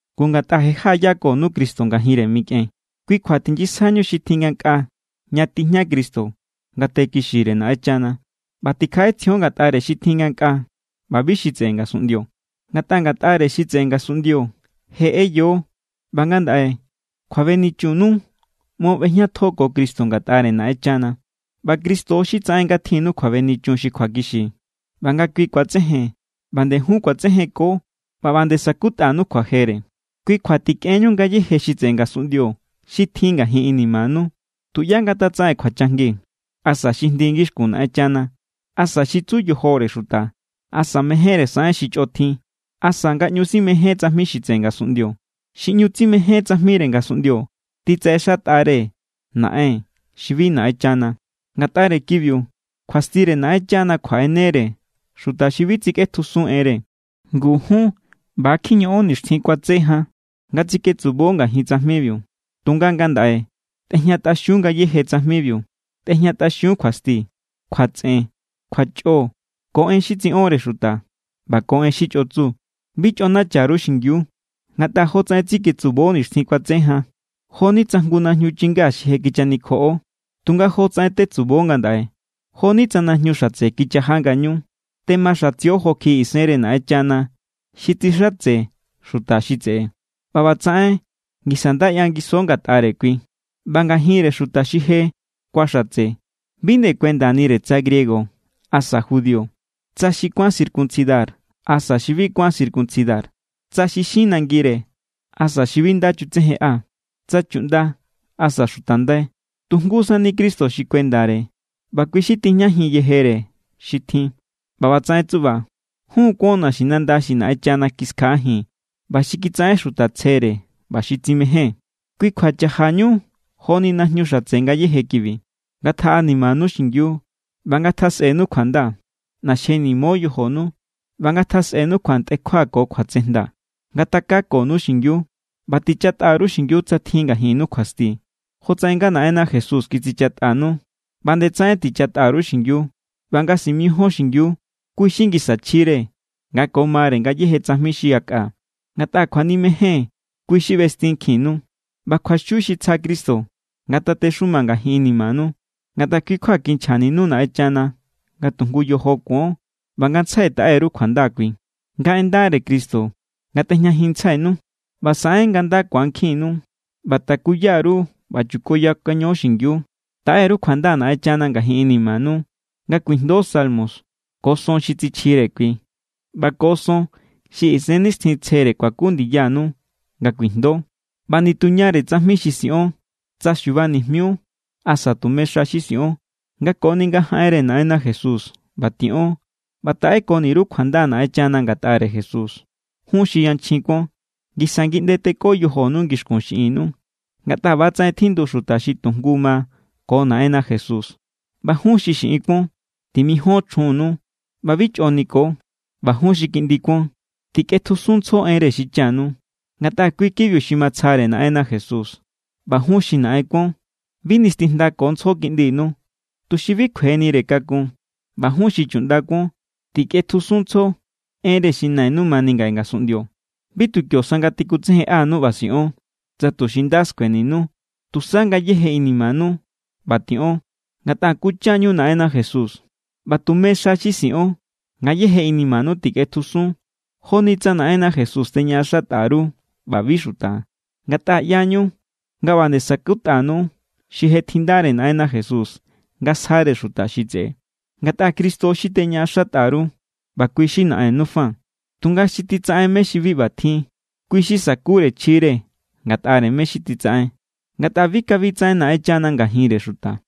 Ngu, ngatꞌa je jaꞌayakonu Cristo ngajinre mikꞌen, kui kjua tinyisjaiñu xi tjin ngankꞌaa ña tijña Cristo ngate kixire Naꞌenchana. ꞌBa tikjaꞌetsjion ngatꞌare xi tjin ngankꞌaa ꞌba bi xi tseꞌe ngasunꞌndio. Ngatꞌa ngatꞌare xi tseꞌe ngasunꞌndio je ꞌeyo ꞌba ngandaꞌe kjuabenichunnu ꞌmo ꞌbejñatjo ko Cristo ngatꞌare Naꞌenchana. ꞌBa Cristo= xi tsaꞌen nga tjinnu kjuabenichun xi kjuakixi. ꞌBa nga kui ku̱atsejen, ꞌba nde jun ku̱atsejenko ꞌba ꞌba nde sa̱kutꞌanu kjuajere. Kui kjua tikꞌenñu ngayéje xi tseꞌe ngasunꞌndio xi tjin ngajin inimanu. Tuꞌyá ngatatsaꞌen kjuachajngi, asa xi jndi ngixkun Naꞌenchana, asa xi tsu yojore xuta, asa mejénre saꞌen xi chꞌo tjin, asa nga ꞌñu simején tsajmi xi tseꞌe ngasunꞌndio. Xi ꞌñu tsimején tsajmire ngasunꞌndio titsaꞌexatꞌare naꞌen xi bi Naꞌenchana. Ngatꞌare kibiu kjuastire Naꞌenchana kjuaꞌene=re xuta xi bi tsikꞌetjusun enre. Ngu jun ꞌba= kjiñoꞌon nixtjin kuatse jan, nga tsiketsubo ngajin tsajmibiu. Tunga ngandaꞌe, tꞌejñatꞌaxiun ngayéje tsajmibiu. Tꞌejñatꞌaxiun kjuasti, kjuatsꞌen, kjuachꞌo, ko en xi tsiꞌonre xuta, ꞌba ko en xi chꞌo tsu. Bi chꞌonacha_ru xingiu, ngatꞌa jotsaꞌen tsiketsubo nixtjin kuatse jan, jo=ni tsa jngu najñu chingá xi je kichanikjoꞌo. Tunga jotsaꞌen tetsubo ngandaꞌe, jo=ni tsa najñu xatse kichaja ngañu. Temaxatsio jo kjiꞌi isenre Naꞌenchana xi tsixatse xuta xi tseꞌe, ꞌba ꞌbatsaꞌen ngisa nda ꞌyangiso ngatꞌare kui. ꞌBa ngajinre xuta xi je kuaxatse, bi nde kuendanire tsa griego asa judío, tsa xi kuán circuncidar asa xi bi kuán circuncidar, tsa xi xin nangire asa xi bi nda chutsejenꞌa, tsa chuꞌnda asa xuta ndai. Tu jngu sani Cristo xi kuendare ꞌba kui xi tijñajin yejere xi tjin. ꞌBa ꞌbatsaꞌen tsuꞌba jun= kuon naxinanda xi Naꞌenchana kiskjaꞌajin ꞌba xi kitsaꞌen xuta tsjere ꞌba xi tsimején. Kui kjua chajañu joni najñu xatse ngayéje kibi. Ngatjaꞌanimanu xingiu ꞌba ngatjasꞌenu kjuanda, ꞌnaxjenimo yojonu, ꞌba ngatjasꞌenu kjuantꞌekjua ko kjuatsejnda. Ngatakakonu xingiu, ꞌba tichatꞌa_ru xingiu tsa tjin ngajinnu kjuasti. Jotsaꞌen nga Naꞌenna Jesús kitsichatꞌanu, ꞌba nde tsaꞌen tichatꞌa_ru xingiu. ꞌBa nga simijíon xingiu, kui= xi ngisa chjire nga ko mare ngayéje tsajmi xi yakꞌa, ngatꞌa kjuanimejen kui xi ꞌbestinkjinnu. ꞌBa kjuaxiu xi tsja Cristo ngatatexuma ngajin inimanu. Ngatꞌa kui= kjua kinchjaninu Naꞌenchana, nga tu jngu yojo kuon. ꞌBa ngantsjai taꞌe_ru kjuanda kui. Nga en ndare Cristo ngatꞌejñajinntsjainu ꞌba saꞌen nga nda ku̱ankjinnu. ꞌBa takuya_ru ꞌba chukoyakaño xingiu. Taꞌe_ru kjuanda Naꞌenchana ngajin inimanu nga kuijndo salmo ko son xi tsichjire kui ꞌba ko son xi Isennixtjintsjere kuaku ndiyanu nga kuijndo. ꞌBa nituñare tsajmi xi siꞌon, tsa xubanijmiu asa tume xa xi siꞌon, nga koni nga jaꞌenre Naꞌenna Jesús ꞌba tiꞌon ꞌba taꞌekoni_ru kjuanda Naꞌenchana ngatꞌare Jesús. Jun xi yanchjin kuon, ngisa ngiꞌnde teko yojonu ngixkun xiꞌinnu, ngatꞌa ꞌba=tsaꞌen tjindu xuta xi tu jngu ma ko Naꞌenna Jesús. ꞌBa jun xi xiꞌin kuon, timijon chjunnu ꞌba bi chꞌo niko. ꞌBa jun xi kiꞌndi kuon, tikꞌetjusunntsjo enre xichanu. Ngatꞌa kui kibiu xi matsjare Naꞌenna Jesús. ꞌBa jun xi naꞌen kuon, bi nistijndakontsjo kiꞌndinu, tuxi bi kjuenire kakun. ꞌBa jun xi chuꞌnda kuon, tikꞌetjusunntsjo enre xi nainu mani ngaꞌe ngasunꞌndio. Bi tu kio sa nga tikutsejenꞌanu ꞌba siꞌon, tsa tuxi nda skueninu. Tusa ngayéje inimanu ꞌba tiꞌon, ngatꞌa kuncha=ñu Naꞌenna Jesús. ꞌBa tume xa xi siꞌon ngayéje inimanu tikꞌetjusun, joni tsa Naꞌenna Jesús teñaꞌaxatꞌa_ru ꞌba bi xuta. Ngatꞌa ꞌyañu nga ꞌba nde sa̱kutꞌanu xi je tjindare Naꞌenna Jesús nga sjare xuta xi tseꞌe. Ngatꞌa Cristo xi teñaꞌaxatꞌa_ru ꞌba kui xi Naꞌennu fa. Tunga xi titsaꞌen mé= xi bi ꞌbatjin, kui xi sa̱kure chjire ngatꞌare mé= xi titsaꞌen. Ngatꞌa bi kabi tsaꞌen Naꞌenchana ngajinre xuta.